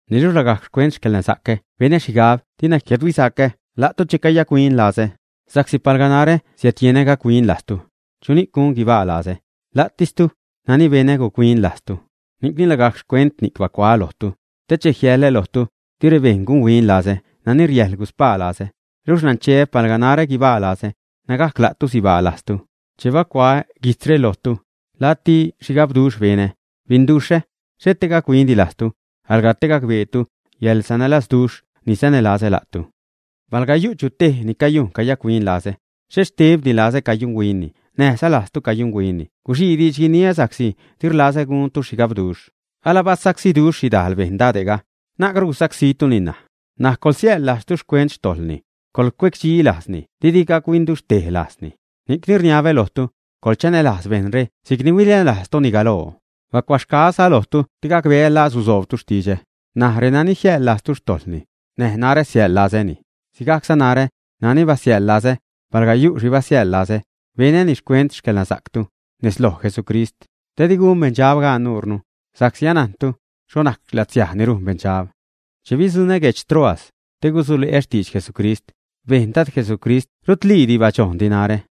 Niluxh lagajc xcuent xcäḻnasa'cä benä xhigab dina jiädhuisacä la'tu che cayac-huin lazä. Sa'csi palga narä siädyenä gac-huin lajztu, ¿chuni'c gun guibaa lazä? La'tistu, nani benä guc-huin lajzni. Ni'cni lagajc xcuent ni'c bacuaä lojtu, te che jiäḻä lojtu, di rebejṉ gunhuin lazä nani riäjḻ guspaa lazä. Luxh nancheä palga narä guibaa lazä, nägajc la'tu sibaaza lajztu. Che bacuaä guijtzga lojtu, lacti xhigabduxh benä, binduxhä; xhet te gac-huindi lajztu, alga te gacbeetu yäḻsanälazduxh ni sanälazä la'tu. Palga yu' chu tej ni cayujn cayac-huin lazä, xhet xtebtis lazä cayunhuinni näjza lajztu cayunhuinni guxii diidx guiniä sa'csi di rlazä guntu xhigabduxh. Alabasacsiduxh xhidajl bejṉ dade'ga, na'cru gusacsítuni ṉaj. N̲aj coḻsiäjḻ lajztu xcuent xtojḻni, coḻcuecdxi lajzni didi gac-huinduxhtej lajzni. Ni'cni rniabä lojtu, coḻchanälajz bejṉre si'c ni huinälajztuni galoo. Bacuaxgaäza lojtu te gacbeä laa susoobtu xtidxä. N̲aj renani jiäjḻ lajztu xtojḻni, näj narä siäjḻ lazäni. Sigajcza narä, nani basiäjḻ lazä, palga yu' xhi basiäjḻ lazä, benäni xcuent xcäḻnasa'ctu, nez loj Jesucrist, te di gun beṉdxab gaan nuure, sa'csi anajnnu xho najc latsiaj ni rujn beṉdxab. Che bidzuṉä guedx Troas, te gusule'ä xtidx Jesucrist, bejn Dad Jesucrist rutliidi badxojndi narä,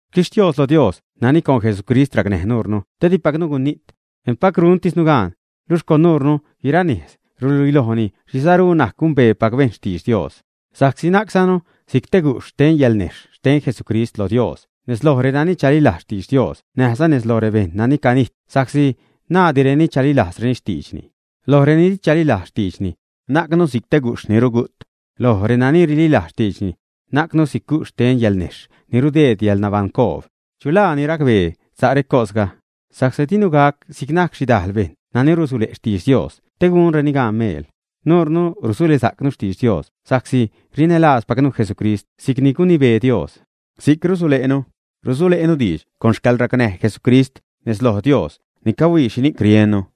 Xquixtios lo Dios nani con Jesucrist racnäj nuurnu te dipacnu gunijt, empac rujntisnu gaan, luxh con nuurnu guiraa nejz ruluilojni xhi saru najc gumbeepac bejṉ xtidx Dios. Sa'csi najczanu si'c te guxh xten yalnejxh xten Jesucrist lo Dios nez loj renani chalilajz xtidx Dios näjza nez loj rebejṉ nani canijt sa'csi naadireni chalilajzreni xtiidxni. Loj reni di chalilajz xtiidxni, najcnu si'c te guxh ni rugu't, loj renani rililajz xtiidxni, najcnu si'c guxh xten yalnejxh ni rudeed yäḻnabaṉcoob. ¿Chu laa ni racbee sa' recosga? Sa'csi dinu gac si'c najc xhidajl bejṉ nani rusule' xtidx Dios te gunreni gaan meel. Nuure rusulesa'cnu xtidx Dios sa'csi rinälaazpacnu Jesucrist luxh si'c ni gunibee Dios, si'c rusule'nu, rusule'nu diidx con xcäḻracnäj Jesucrist nez loj Dios ni cahuii xhini'c riennu.